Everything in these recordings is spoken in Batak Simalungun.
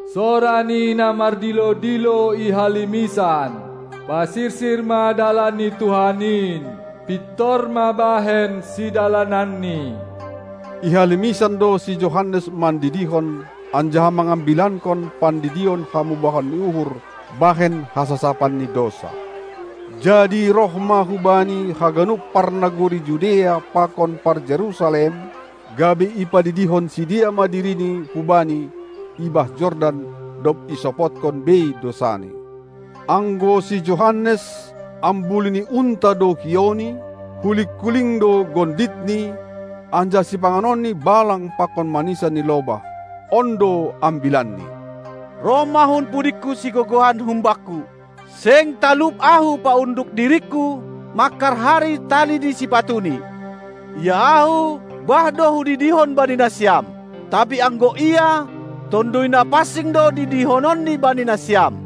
Sora ni na mardilo-dilo i halimisan: Pasirsir ma dalan ni Tuhan in, pintor ma bahen sidalananNi. I halimisan do si Johannes mandidihon anjaha mangambilankon pandidion hamubahon ni uhur bahen hasasapan ni dousa. Jadi roh ma hubani haganup parnagori Judea pakon par-Jerusalem, gabe ipadidihon sidea ma dirini hubani i bah Jordan, dob isopotkon bei dousani. Anggo si Johannes, ambulu ni unta do hiouni, huling-kuling gonditni anjaha sipanganonni balang pakon manisan ni lobah. On do ambilanni: Roh ma hun pudingku sigogohan humbakku, seng talup ahu paunduk diringku mangharhari tali ni sipatuni. Ia ahu, bah do hudidihon bani nasiam, tapi anggo Ia, Tonduy Na pansing do didihononNi bani nasiam.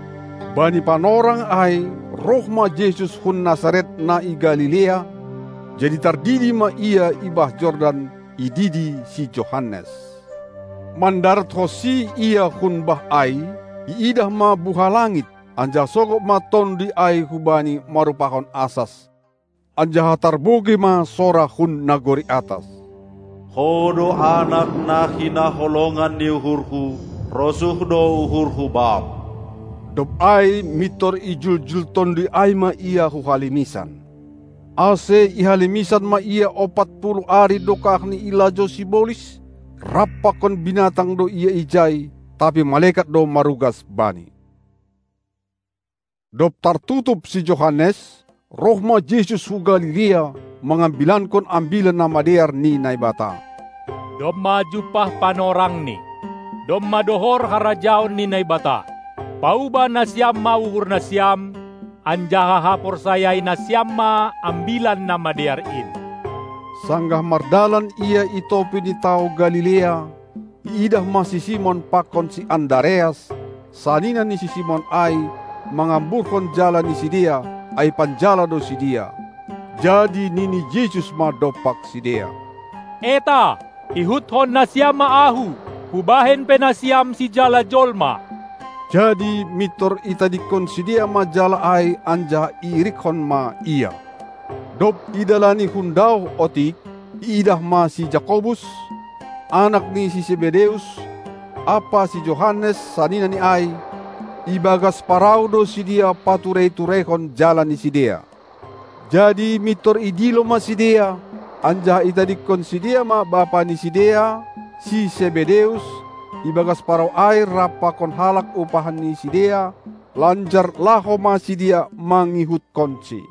Bani panorang ai roh ma Jesus hun Nasaret na i Galilea, jadi tardidi ma Ia i bah Jordan, ididi si Johanes. Mandarathonsi Ia hun bah ai, iidah ma buha langit, anjaha sogop ma Tonduy ai hu Bani marrupahon asas. Anjaha tarbogei ma sora hun nagori atas: Ho do Anak na hinaholongan ni uhurHu, rosuh do uhurHu Bam. Dob ai mintor ijuljul Tonduy ai ma Ia hu halimisan. Ase i halimisan ma Ia ompat puluh ari dokahni ilajou sibolis; rap pakon binatang do Ia ijai, tapi malekat do marugas Bani. Dob tartutup si Johannes, roh ma Jesus hu Galilea mangambilankon Ambilan Namadear ni Naibata: Domma jumpah panorangni; domma dohor harajaon ni Naibata. Paubah nasiam ma uhur nasiam anjaha haporsayai nasiam ma Ambilan Namadear in! Sanggah mardalan Ia i topi ni tao Galilea, iidah ma si Simon pakon si Andareas, sanina ni si Simon ai mangamburhon jala ni sidea; ai panjala do sidea. Jadi nini Jesus ma dompak sidea: Eta, ihutkon nasiam ma Ahu, Hubahen pe nasiam sijala jolma! Jadi mintor itadingkon sidea ma jala ai anjaha irikkon ma Ia. Dob idalani hundaoh otik, iidah ma si Jakobus, anak ni si Sebedeus, ampa si Johannes, saninani ai; ibagas parau do sidea paturei-tureihon jala ni sidea. Jadi mintor idilo ma sidea; anjaha itadingkon sidea ma bapa ni sidea, si Sebedeus, ibagas parau ai rap pakon halak upahan ni sidea, lanjar laho ma sidea mangihutkonsi.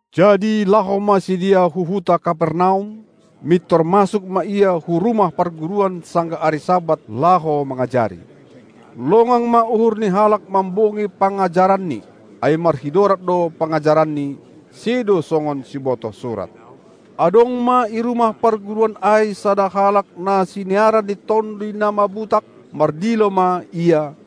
Jadi laho ma sidea hu huta Kapernaum; mintor masuk ma Ia hu rumah parguruan sanggah ari Sabat laho mangajari. Longang ma uhur ni halak mambogei pangajaranNi, ai marhidorat do pangajaranNi, sedo songon sibotoh surat. Adong ma i rumah parguruan ai sada halak na siniaran ni toduy na mabutak, mardilo ma ia,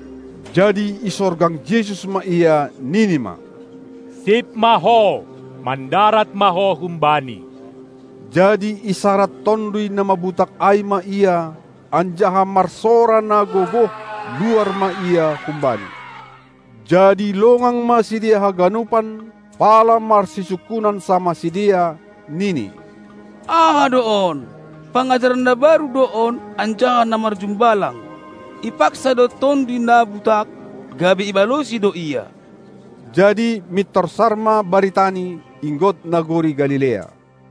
Jadi isorgang Jesus ma ia, nini ma: Sip ma ho, mandarat ma ho humbani! Jadi isarad tonduy na mabutak ai ma ia, anjaha marsora na gogoh luar ma ia humbani. Jadi longang ma sidea haganupan, pala marsisungkunan samah sidea, nini: Aha do on? Pangajaran na baru do on anjaha na marjumbalang; ipaksa do tonduy na butak, gabe ibalosi do Ia. Jadi mintor sar ma baritaNi inggot nagori Galilea.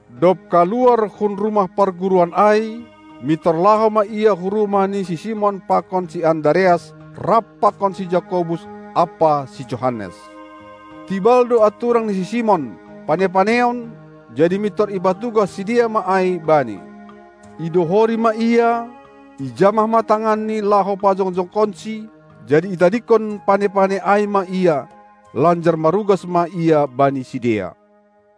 Dob kaluar hun rumah parguruan ai, mintor laho ma Ia hu rumah ni si Simon pakon si Andareas rap pakon si Jakobus ampa si Johannes. Tibal do anturang ni si Simon, pane-paneon, jadi mintor ipatugah sidea ma ai Bani. Idohori ma ia, ijamah ma tanganni laho pajongjongkonsi, jadi itadingkon pane-pane ai ma ia, lanjar marugas ma ia bani sidea.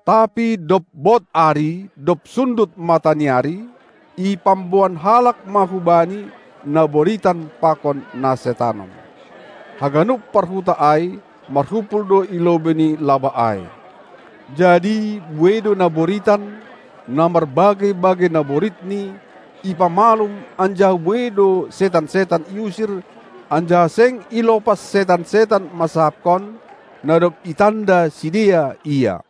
Tapi dob bod ari dob sundut mataniari, ipamboan halak ma hu Bani na boritan pakon na setanon. Haganup parhuta ai marhumpul do i lobei ni labah ai. Jadi buei do na boritan, na marbagei-bagei naboritni, ipamalum, anjaha buei do setan-setan iusir, anjaha seng ilopas setan-setan mansahapkon, na dob itanda sidea Ia.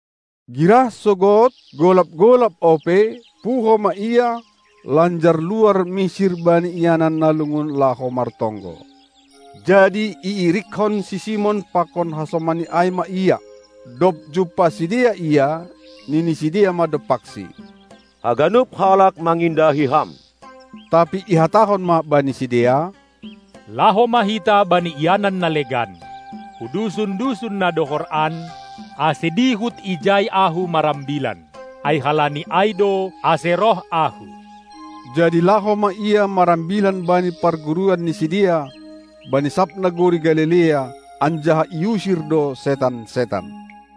Girah sogod, golap-golap ope, puho ma Ia, lanjar luar misir bani ianan na lungun laho martonggo. Jadi iirikkon si Simon pakon hasomanni ai ma Ia. Dob jumpah sidea Ia, nini sidea ma dompakSi: Haganup halak mangindahi Ham! Tapi ihatahon ma bani sidea: Laho ma hita bani ianan na legan, hu dusun-dusun na dohor an, ase dihut ijai Ahu marambilan; ai halani ai do, ase roh Ahu. Jadi laho ma Ia marambilan bani parguruan ni sidea, bani sab nagori Galilea, anjaha iusir do setan-setan.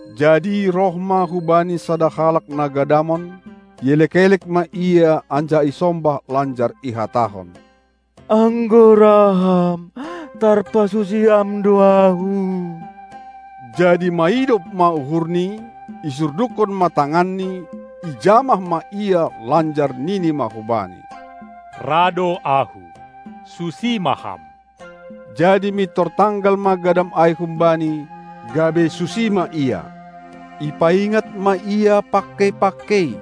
Jadi roh ma hu Bani sada halak na gadamon, ielek-elek ma Ia anjaha isombah lanjar ihatahon: Anggo ra Ham, tarpasusi Ham do ahu! Jadi maidop ma uhurNi, isurdukkon ma tanganNi, ijamah ma ia lanjar nini ma hubani: Ra do Ahu, susi ma ham! Jadi mintor tanggal ma gadam ai humbani, gabe susi ma ia. Ipaingat ma ia pangkei-pangkei,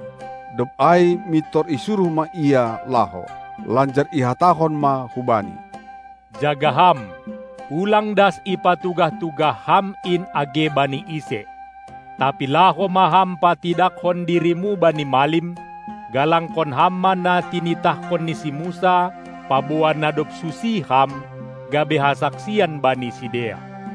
dob ai mintor isuruh ma ia laho, lanjar ihatahon ma hubani: Jaga ham, ulang das ipatugah-tugah ham in age bani ise! Tapi laho ma ham patidakkon dirimu bani malim, galangkon ham ma na tinitahkon ni si Musa, paboa na dob susi ham, gabe hasaksian bani sidea.